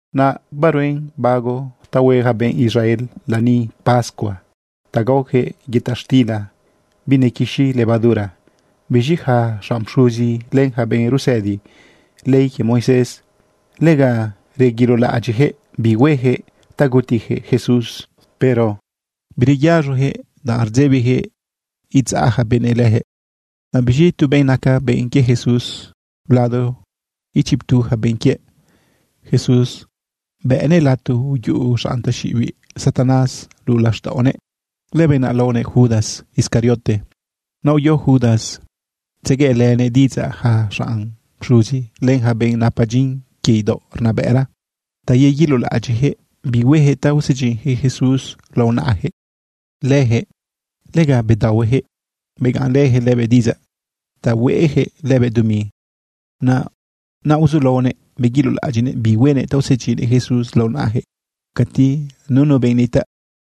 Naꞌ baruen bago ta hue yaca benꞌ Israel lani pascua ta gaoyaquëꞌ yëta xtila binequixi levadura. Biz̃i yaca xanꞌ pxuzi len yaca benꞌ rusëdi ley quie Moisés, lega reguilolaꞌadyiꞌyaquëꞌ bi hueyaquëꞌ ta gutiyaquëꞌ Jesús. Pero bireyaz̃oyaquëꞌ, danꞌ rdzebiyaquëꞌ idzaꞌ yaca benëꞌ leyaquëꞌ. Naꞌ biz̃i tu benꞌ naca benꞌ quie Jesús lado ichiptu yaca benꞌ quie Jesús bëꞌnëꞌ lato uyuꞌu xanꞌ taxiꞌibiꞌ Satanás luꞌu laxtaꞌonëꞌ. Lëbenꞌ naꞌ laonëꞌ Judas Iscariote. Naꞌ uyo Judas tzegueꞌlënëꞌ diꞌidzaꞌ yaca xanꞌ pxuzi, len yaca benꞌ napa dyin quie idaoꞌ rnabëꞌra ta yeguilolaꞌadyiꞌyaquëꞌ bi hueyaquëꞌ ta usedyinnëꞌ Jesús lao naꞌayaquëꞌ. Leyaquëꞌ lega bedaohueyaquëꞌ begaꞌnlëyaquëꞌ lëbëꞌ diꞌidzaꞌ ta hueꞌyaquëꞌ lëbëꞌ dumi. Naꞌ uzulaonëꞌ beguilolaꞌadyiꞌnëꞌ bi huenëꞌ ta usedyinnëꞌ Jesús lao naꞌayaquëꞌ cati nunu benꞌ nitaꞌ.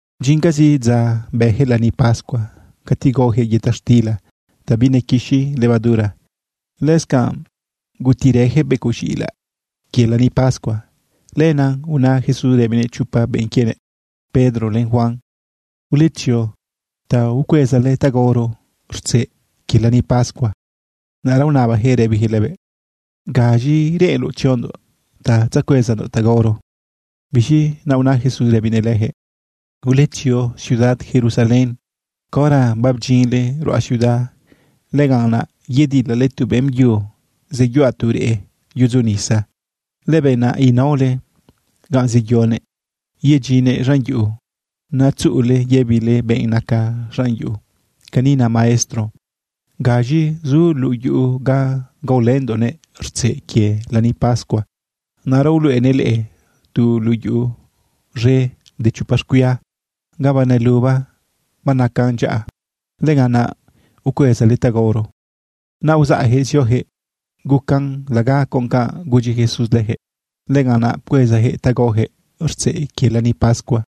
Bdyincazi dza bëyaquëꞌ lani pascua cati gaoyaquëꞌ yëta xtila ta binequixi levadura, lëscanꞌ gutirëyaquëꞌ becoꞌ z̃iꞌilaꞌ quie lani pascua. Lenaꞌ una Jesús rëbinëꞌ chopa benꞌ quienëꞌ, Pedro len Juan: ―Uletzio ta ucuezale ta gaoro rtzeꞌ quie lani pascua. Naꞌra unabayaquëꞌ rëbiyaquëꞌ lëbëꞌ: ―¿Gaz̃i reꞌenloꞌ tziondoꞌ ta tzacuezandoꞌ ta gaoro? Biz̃i naꞌ una Jesús rëbinëꞌ leyaquëꞌ: ―Uletzio ciudad Jerusalén. Caora babdyinle ruꞌa ciudad, lëganꞌ naꞌ yedilale tu beꞌmbyu zeyuꞌa tu reꞌ yudzo nisa. Lëbenꞌ naꞌ inaole ganꞌ zeyonëꞌ yedyinnëꞌ z̃an yuꞌu. Naꞌ tzuꞌule yëbile benꞌ naca xanꞌ yuꞌu: “Cani na Maestro: ¿Gaz̃i zu luꞌu yuꞌu ga gaolëndoꞌnëꞌ rtzeꞌ quie lani pascua?” Naꞌra uluꞌenëꞌ leꞌe tu luꞌu yuꞌu z̃e de chopa xcuia ga baneluban banacan dyaꞌa. Lëganꞌ naꞌ ucuezale ta gaoro. Naꞌ uzaꞌyaquëꞌ zioyaquëꞌ gucan laga con canꞌ gudyi Jesús leyaquëꞌ. Lëganꞌnaꞌ pcuezayaquëꞌ ta gaoyaquëꞌ rtzeꞌ quie lani pascua.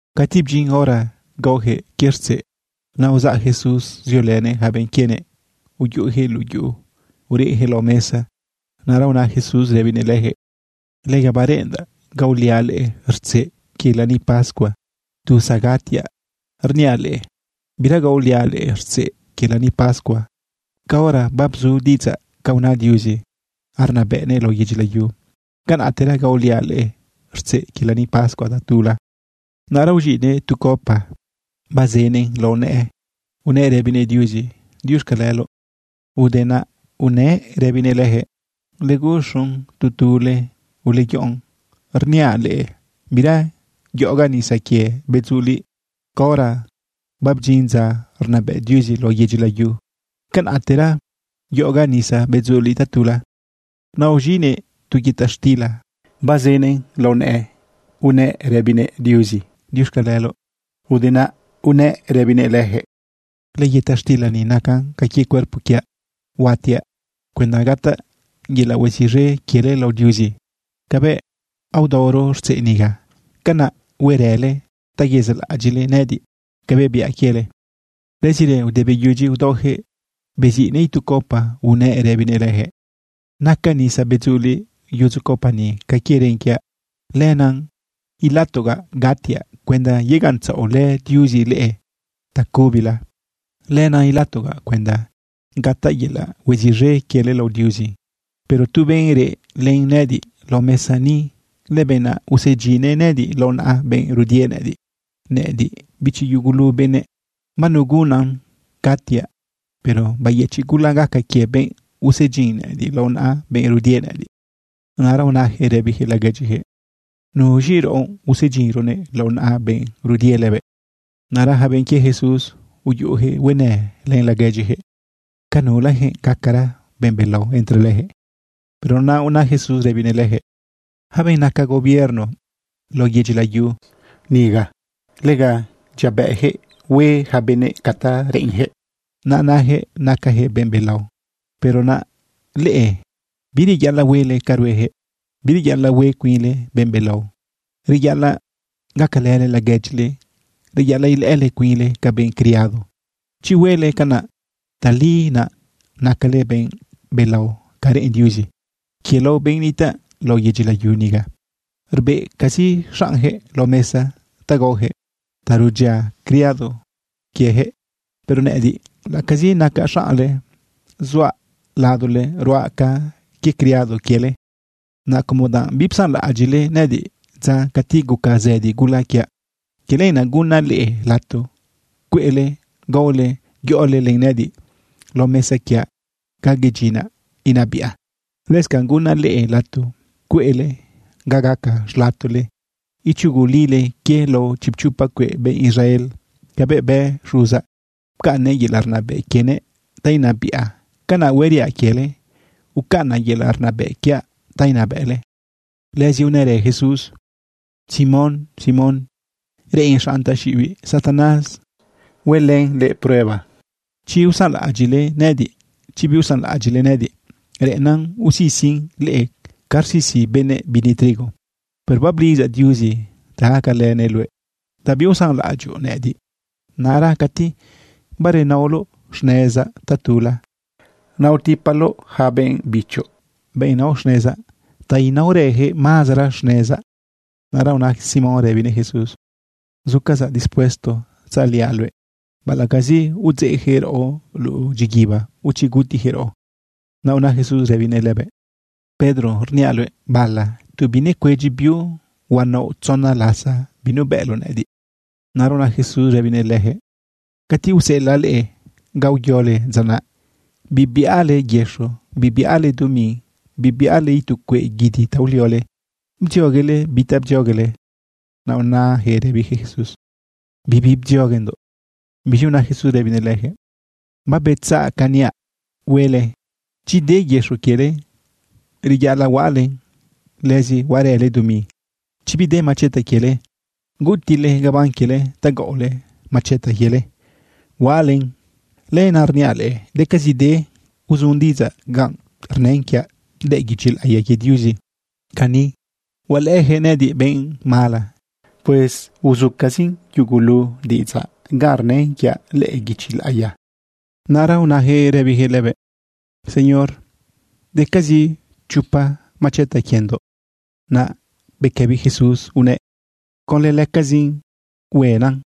Cati bdyin hora gaoyaquëꞌ quie rtzeꞌ, naꞌ uzaꞌ Jesús ziolënëꞌ yaca benꞌ quienëꞌ uyuꞌuyaquëꞌ luꞌu yuꞌu ureꞌyaquëꞌ lao mesa. Naꞌra una Jesús rëbinëꞌ leyaquëꞌ: ―Lega bareꞌendaꞌ gaoliaꞌ leꞌe rtzeꞌ quie lani pascua tu zagatiaꞌ. Rniaꞌ leꞌe, bira gaoliaꞌ leꞌe rtzeꞌ quie lani pascua. Caora babzu diꞌidzaꞌ ca una Diuzi arnabëꞌnëꞌ lao yedyi layu, canaꞌtera gaoliaꞌ leꞌe rtzeꞌ quie lani pascua tatula. Naꞌra uz̃iꞌnëꞌ tu copa, bazënëꞌn lao nëꞌë, unëꞌ rëbinëꞌ Diuzi: ―Diuxcaleloꞌ. Ude naꞌ unëꞌ rëbinëꞌ leyaquëꞌ: ―Uleguxun tu tule, uleyoꞌon. Rniaꞌ leꞌe, bira yoꞌogaꞌ nisa quie bedzuliꞌ. Caora babdyin dza arnabëꞌ Diuzi lao yedyi layu, canaꞌtera yoꞌogaꞌ nisa bedzuliꞌ tatula. Naꞌ uz̃iꞌnëꞌ tu yëta xtila bazënëꞌn lao nëꞌë unëꞌ rëbinëꞌ Diuzi: ―Diuxcaleloꞌ. Ude naꞌ unëꞌ rëbinëꞌ leyaquëꞌ: ―Lëyëta xtila ni nacan ca quie cuerpo quiaꞌ. Huatiaꞌ cuenda gataꞌ yelaꞌ hueziꞌz̃e quiele lao Diuzi. Cabëꞌ aodaoro rtzeꞌ niga, canaꞌ huerële ta yezaꞌlaꞌadyiꞌle nëꞌëdiꞌ cabëꞌ biaꞌ quiele. Lëzirë, ude beyudyi udaoyaquëꞌ, beziꞌnëꞌ itu copa unëꞌ rëbinëꞌ leyaquëꞌ: ―Naca nisa bedzuliꞌ yudzu copa ni ca quie ren quiaꞌ. Lenaꞌ ilatogaꞌ gatiaꞌ cuenda yegaꞌntzaꞌolë Diuzi leꞌe tacubila. Lenaꞌ ilatogaꞌ cuenda gataꞌ yelaꞌ hueziꞌz̃e quiele lao Diuzi. ’Pero tu benꞌ reꞌ len nëꞌëdiꞌ lao mesa ni, lëbenꞌ naꞌ usedyinnëꞌ nëꞌëdiꞌ lao naꞌa benꞌ rudie nëꞌëdiꞌ. Nëꞌëdiꞌ, bichi yugulu benëꞌ, banugunnan gatiaꞌ. Pero bayëchiꞌ gula gaca quie benꞌ usedyin nëꞌëdiꞌ lao naꞌa benꞌ rudie nëꞌëdiꞌ. Naꞌra unayaquëꞌ rëbiyaquëꞌ laguedyiyaquëꞌ: ―¿Nuz̃i raꞌo usedyinronëꞌ lao naꞌa benꞌ rudie lëbëꞌ? Naꞌra yaca benꞌ quie Jesús uyuꞌuyaquëꞌ huenë len laguedyiyaquëꞌ ca nulayaquëꞌ gacara benꞌ belao entre leyaquëꞌ. Pero naꞌ una Jesús rëbinëꞌ leyaquëꞌ: ―Yaca benꞌ naca gobierno lao yedyi layu niga, lega dyiabëꞌyaquëꞌ hue yaca benëꞌ ca ta reꞌenyaquëꞌ. Naꞌ nayaquëꞌ nacayaquëꞌ benꞌ belao. Pero naꞌ leꞌe bireyaꞌalaꞌ huele ca rueyaquëꞌ. Bireyaꞌalaꞌ hue cuinle benꞌ belao. Reyaꞌalaꞌ gacalële laguedyile. Reyaꞌalaꞌ ilëꞌële cuinle ca benꞌ criado. Chi huele canaꞌ, tali naꞌ nacale benꞌ belao ca reꞌen Diuzi. Quie lao benꞌ nitaꞌ lao yedyi layu niga, rbeꞌcazi xaꞌnyaquëꞌ lao mesa ta gaoyaquëꞌ ta rudyia criado quieyaquëꞌ. Pero nëꞌëdiꞌ, laꞌacazi nacaꞌ xaꞌnle, zuaꞌ ladole ruaꞌ ca quie criado quiele. ’Naꞌ como danꞌ bipsanlaꞌadyiꞌle nëꞌëdiꞌ dza cati guca zëdi gula quiaꞌ, quie lenaꞌ, gunaꞌ leꞌe lato cueꞌle gaole yoꞌole len nëꞌëdiꞌ lao mesa quiaꞌ ga yedyinaꞌ inabiꞌa. Lëscanꞌ gunaꞌ leꞌe lato cueꞌle ga gaca xlatole ichugolile quie lao chipchopa cueꞌ benꞌ Israel. Cabëꞌ bë Xuzaꞌ, pcaꞌnnëꞌ yelaꞌ rnabëꞌ quienëꞌ ta inabiꞌa, canaꞌ hueriaꞌ quiele, ucaꞌnaꞌ yelaꞌ rnabëꞌ quiaꞌ ta inabëꞌle. Lëzi unërë Jesús: ―Simón, Simón, reꞌen xanꞌ taxiꞌibiꞌ Satanás huelën leꞌe prueba, chi usanlaꞌadyiꞌle nëꞌëdiꞌ, chi biusanlaꞌadyiꞌle nëꞌëdiꞌ. Reꞌennan usisin leꞌe ca rsisi benëꞌ bini trigo. Pero bablidzaꞌ Diuzi ta gacalënëꞌ luëꞌ ta biusanlaꞌadyoꞌ nëꞌëdiꞌ. Naꞌra cati barenaoloꞌ xnezaꞌ tatula, naꞌ utipaloꞌ yaca benꞌ bichoꞌ, benꞌ nao xnezaꞌ, ta inaorayaquëꞌ mazara xnezaꞌ. Naꞌra una Simón rëbinëꞌ Jesús: ―Zucazaꞌ dispuesto tzaliaꞌ luëꞌ, baꞌalaꞌcazi udzeꞌyaquëꞌ raꞌo luꞌu dyiguiba, o chi gutiyaquëꞌ raꞌo. Naꞌ una Jesús rëbinëꞌ lëbëꞌ: ―Pedro, rniaꞌ luëꞌ, bala tu binecuedyi biu, huanaoꞌ tzona lasa binubëꞌloꞌ nëꞌëdiꞌ. Naꞌra una Jesús rëbinëꞌ leyaquëꞌ: ―Cati useꞌelaꞌ leꞌe ga uyole dza naꞌ, bibiꞌale yëxo, bibiꞌale dumi, bibiꞌale itu cueꞌ guidi ta uliole, ¿bdzioguele bi ta bdzioguele? Naꞌ unayaquëꞌ rëbiyaquëꞌ Jesús: ―Bibi bdzioguendoꞌ. Biz̃i una Jesús rëbinëꞌ leyaquëꞌ: ―Babetzaꞌ ca niaꞌ huele. Chi de yëxo quiele, reyaꞌalaꞌ huaꞌalen, lëzi huaꞌarële dumi. Chi bide macheta quiele, gutiꞌle gabán quiele ta gaꞌole macheta quiele huaꞌalen. Lenaꞌ rniaꞌ leꞌe, decazide uzun diꞌidzaꞌ ganꞌ rnën quiaꞌ lëꞌë guichi laꞌiya quie Diuzi cani: “Hualëꞌëyaquëꞌ nëꞌëdiꞌ benꞌ mala.” Pues uzucazi yugulu diꞌidzaꞌ ganꞌ rnën quiaꞌ lëꞌë guichi laꞌiya. Naꞌra unayaquëꞌ rëbiyaquëꞌ lëbëꞌ: ―Señor, decazi chopa macheta quiendoꞌ. Naꞌ bequëbi Jesús unëꞌ: ―Conlë lëcazin hueꞌennan.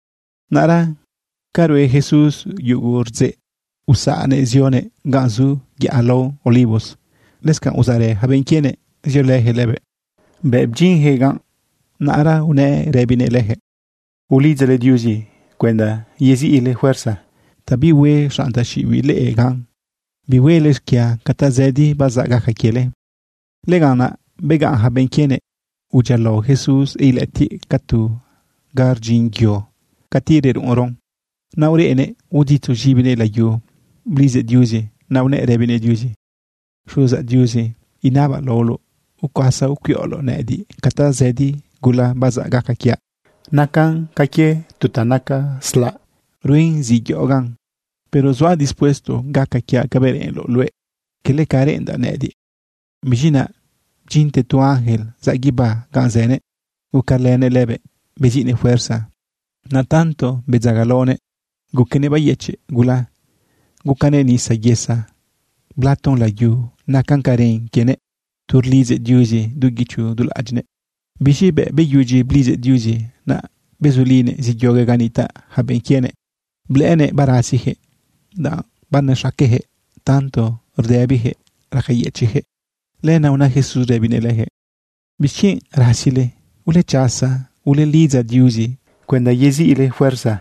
Naꞌra ca rue Jesús yugu rdzeꞌ, uzaꞌnëꞌ zionëꞌ ganꞌ zu yaꞌa lao Olivos. Lëscanꞌ uzaꞌrë yaca benꞌ quienëꞌ ziolëyaquëꞌ lëbëꞌ. Bëꞌ bdyinyaquëꞌ ganꞌ, naꞌra unëꞌ rëbinëꞌ leyaquëꞌ: ―Ulidzale Diuzi cuenda yeziꞌle fuerza ta bihue xanꞌ taxiꞌibiꞌ leꞌe gan bihuele xquia ca tazëdi bazaꞌ gaca quiele. Lëganꞌ naꞌ begaꞌn yaca benꞌ quienëꞌ udyialao Jesús ilëꞌëtiꞌ ca tu ga rdyin yo cati reruꞌunron. Naꞌ ureꞌnëꞌ uditzu z̃ibinëꞌ layu blidzëꞌ Diuzi. Naꞌ unëꞌ rëbinëꞌ Diuzi: ―Xuzaꞌ Diuzi, inabaꞌ laoloꞌ ucuasa ucuiꞌoloꞌ nëꞌëdiꞌ ca tazëdi gula bazaꞌ gaca quiaꞌ. Nacan ca quie tu ta naca slaꞌ ruen zi yoꞌogaꞌn. Pero zuaꞌ dispuesto gaca quiaꞌ cabëꞌ reꞌenloꞌ luëꞌ, cala ca reꞌendaꞌ nëꞌëdiꞌ. Biz̃i naꞌ bdyinte tu ángel zaꞌ guibá ganꞌ zënëꞌ, gucalënëꞌ lëbëꞌ beziꞌnëꞌ fuerza. Naꞌ tanto bedzagalaonëꞌ guquenëꞌ bayëchiꞌ gula, gucanëꞌ nisa yesa blaton layu nacan ca ren quienëꞌ tu rlidzëꞌ Diuzi du guicho du laꞌadyiꞌnëꞌ. Biz̃i bëꞌ beyudyi blidzëꞌ Diuzi, naꞌ bezulinëꞌ zeyoguëꞌ ganꞌ nitaꞌ yaca benꞌ quienëꞌ, blëꞌënëꞌ barasiyaquëꞌ, danꞌ banexaqueyaquëꞌ tanto rdëbiyaquëꞌ racayëchiꞌyaquëꞌ. Lenaꞌ una Jesús rëbinëꞌ leyaquëꞌ: ―¿Bixquienꞌ rasizile? Ulechasa ulelidza Diuzi cuenda yeziꞌle fuerza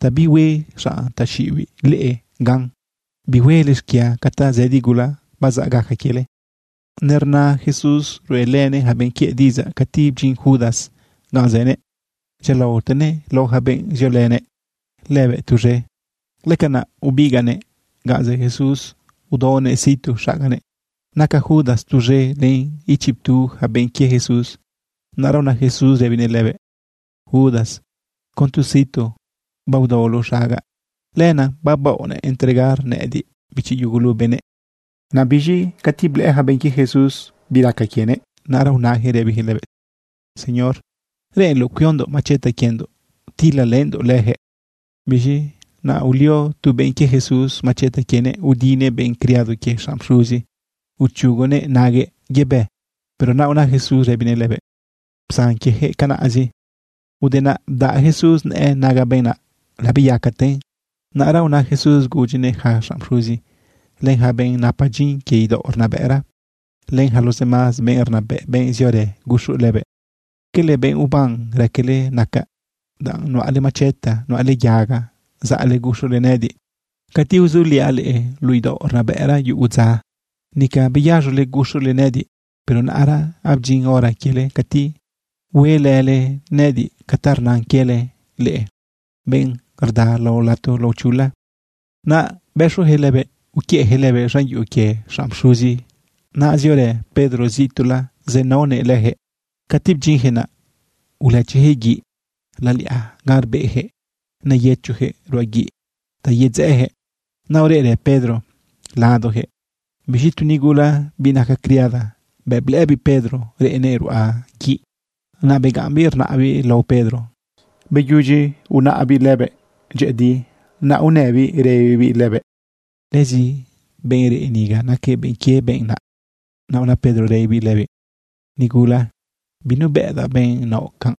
ta bihue xanꞌ taxiꞌibiꞌ leꞌe gan bihuele xquia ca tazëdi gula bazaꞌ gaca quiele. Nerna Jesús ruꞌelënëꞌ yaca benꞌ quiëꞌ diꞌidzaꞌ cati bdyin Judas ganꞌ zënëꞌ dyialaotenëꞌ lao yaca benꞌ ziolënëꞌ lëbëꞌ tuz̃e. Lëcanaꞌ ubigaꞌnëꞌ ganꞌ zë Jesús udaonëꞌ situ xaganëꞌ. Naca Judas tuz̃e len ichiptu yaca benꞌ quie Jesús. Naꞌra una Jesús rëbinëꞌ lëbëꞌ: ―Judas, con tu situ baodaoloꞌ xagaꞌ, ¿lenaꞌ babaoꞌ entregar nëꞌëdiꞌ, bichi yugulu benëꞌ? Naꞌ biz̃i cati blëꞌë yaca benꞌ quie Jesús bi raca quienëꞌ, naꞌra unayaquëꞌ rëbiyaquëꞌ lëbëꞌ: ―Señor, ¿reꞌenloꞌ cuiondoꞌ macheta quiendoꞌ tilalëndoꞌ leyaquëꞌ? Biz̃i naꞌ ulio tu benꞌ quie Jesús macheta quienëꞌ, udinëꞌ benꞌ criado quie xanꞌ pxuzi, uchugunëꞌ naguëꞌ yebë. Pero naꞌ una Jesús rëbinëꞌ lëbëꞌ: ―Psan quieyaquëꞌ, canaꞌzi. Ude naꞌ bdaꞌ Jesús nëꞌë naga benꞌ naꞌ, labeyacaten. Naꞌra una Jesús gudyinëꞌ yaca xanꞌ pxuzi, len yaca benꞌ napa dyin quie idaoꞌ rnabëꞌra, len yaca los demás benꞌ rnabëꞌ, benꞌ ziorë guxu lëbëꞌ: ―¿Cala benꞌ uban raquele nacaꞌ danꞌ nuꞌale macheta, nuꞌale yaga zaꞌle guxule nëꞌëdiꞌ? Cati uzuliaꞌ leꞌe luꞌu idaoꞌ rnabëꞌra yugu dza, nica beyaz̃ole guxule nëꞌëdiꞌ. Pero naꞌra abdyin hora quiele cati huelële nëꞌëdiꞌ ca ta rnan quiele leꞌe, benꞌ rda lao lato laochula. Naꞌ bëxuyaquëꞌ lëbëꞌ uquiëꞌyaquëꞌ lëbëꞌ z̃an yuꞌu quie xanꞌ pxuzi. Naꞌ ziorë Pedro zituꞌla zenaonëꞌ leyaquëꞌ. Cati bdyinyaquëꞌ naꞌ, ulëchiyaquëꞌ guiꞌ laliꞌa ganꞌ rbeꞌyaquëꞌ neyëchoyaquëꞌ ruꞌa guiꞌ ta yedzeꞌeyaquëꞌ. Naꞌ ureꞌrë Pedro ladoyaquëꞌ. Biz̃i tu nigula, biꞌ naca criada, bëꞌ blëꞌëbiꞌ Pedro reꞌnëꞌ ruꞌa guiꞌ, naꞌ begaꞌmbiꞌ rnaꞌbiꞌ lao Pedro. Beyudyi unaꞌbiꞌ lëbëꞌ dyëꞌëdi, naꞌ unëbiꞌ rëbibiꞌ lëbëꞌ: ―Lëzi benꞌ reꞌ niga, naquëꞌ benꞌ quie benꞌ naꞌ. Naꞌ una Pedro rëbinëꞌ lëbiꞌ: ―Nigula, binubëꞌdaꞌ benꞌ naoꞌ canꞌ.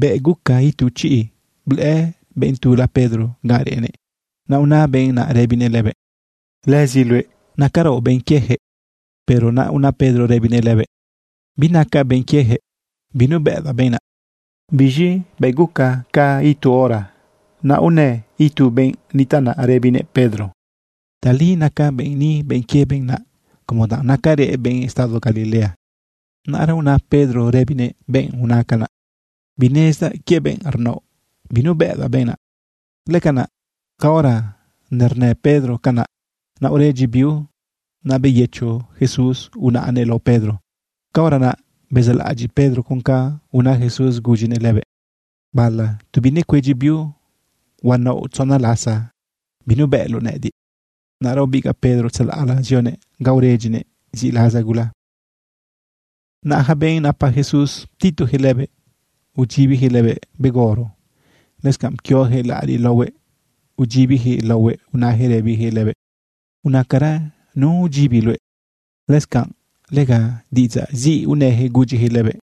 Bëꞌ guca itu chiꞌ, blëꞌë benꞌ tula Pedro ganꞌ reꞌnëꞌ. Naꞌ una benꞌ naꞌ rëbinëꞌ lëbëꞌ: ―Lëzi luëꞌ nacaraoꞌ benꞌ quieyaquëꞌ. Pero naꞌ una Pedro rëbinëꞌ lëbëꞌ: ―Binacaꞌ benꞌ quieyaquëꞌ. Binubëꞌdaꞌ benꞌ naꞌ. Biz̃i bëꞌ guca ca itu hora, naꞌ unë itu benꞌ nitaꞌ naꞌ rëbinëꞌ Pedro: ―Tali naca benꞌ ni benꞌ quie benꞌ naꞌ, como danꞌ nacarëꞌ benꞌ estado Galilea. Naꞌra una Pedro rëbinëꞌ benꞌ una canaꞌ: ―Binezdaꞌ quie benꞌ rnaoꞌ, binubëꞌdaꞌ benꞌ naꞌ. Lëcanaꞌ, caora nernë Pedro canaꞌ, naꞌ uredyi biu. Naꞌ beyëcho Jesús unaꞌnëꞌ lao Pedro. Caora naꞌ bezaꞌlaꞌadyiꞌ Pedro con ca una Jesús gudyinëꞌ lëbëꞌ: “Bala tu binecuedyi biu, huanaoꞌ tzona lasa binubëꞌloꞌ nëꞌëdiꞌ.” Naꞌra ubigaꞌ Pedro tzalaꞌla zionëꞌ ga uredyinëꞌ ziꞌlaza gula. Naꞌ yaca benꞌ napa Jesús, ptituyaquëꞌ lëbëꞌ, udyibiyaquëꞌ lëbëꞌ begorro. Lëscanꞌ pquioyaquëꞌ laꞌariꞌ laohuëꞌ, udyibiyaquëꞌ laohuëꞌ, unayaquëꞌ rëbiyaquëꞌ lëbëꞌ: ―Unacara nu udyibi luëꞌ. Lëscanꞌ lega diꞌidzaꞌ ziꞌ unëyaquëꞌ gudyiyaquëꞌ lëbëꞌ.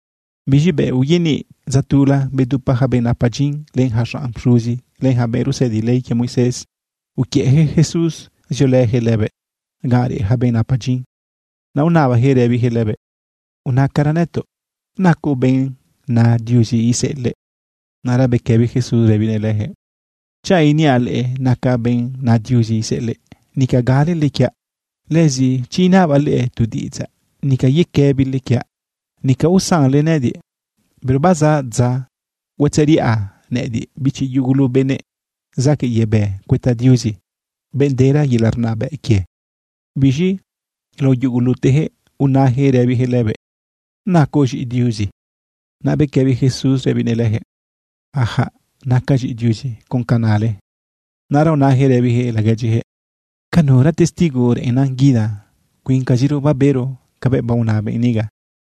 Biz̃i bëꞌ uyaniꞌ dza tula, bedupa yaca benꞌ napa dyin, len yaca xanꞌ pxuzi, len yaca benꞌ rusëdi ley quie Moisés, uquiëꞌyaquëꞌ Jesús ziolëyaquëꞌ lëbëꞌ ganꞌ reꞌ yaca benꞌ napa dyin. Naꞌ unabayaquëꞌ rëbiyaquëꞌ lëbëꞌ: ―Unacara nëtoꞌ ¿nacoꞌ benꞌ na Diuzi iseꞌelëꞌ? Naꞌra bequëbi Jesús rëbinëꞌ leyaquëꞌ: ―Chanꞌ iniaꞌ leꞌe nacaꞌ benꞌ na Diuzi iseꞌelëꞌ, nica galele quiaꞌ. Lëzi chi inabaꞌ leꞌe tu diꞌidzaꞌ, nica yequëbile quiaꞌ, nica usanle nëꞌëdiꞌ. Pero bazaꞌ dza huatzeriꞌa nëꞌëdiꞌ, bichi yugulu benëꞌ, zaquëꞌ yebë cuëta Diuzi, benꞌ dera yelaꞌ rnabëꞌ quie. Biz̃i lao yuguluteyaquëꞌ unayaquëꞌ rëbiyaquëꞌ lëbëꞌ: ―¿Nacoꞌ z̃iꞌi Diuzi? Naꞌ bequëbi Jesús rëbinëꞌ leyaquëꞌ: ―Sí, nacaꞌ z̃iꞌi Diuzi con canꞌ nale. Naꞌra unayaquëꞌ rëbiyaquëꞌ laguedyiyaquëꞌ: ―¿Ca nura testigo reꞌennan guida? Cuincaziro babero cabëꞌ baona benꞌ niga.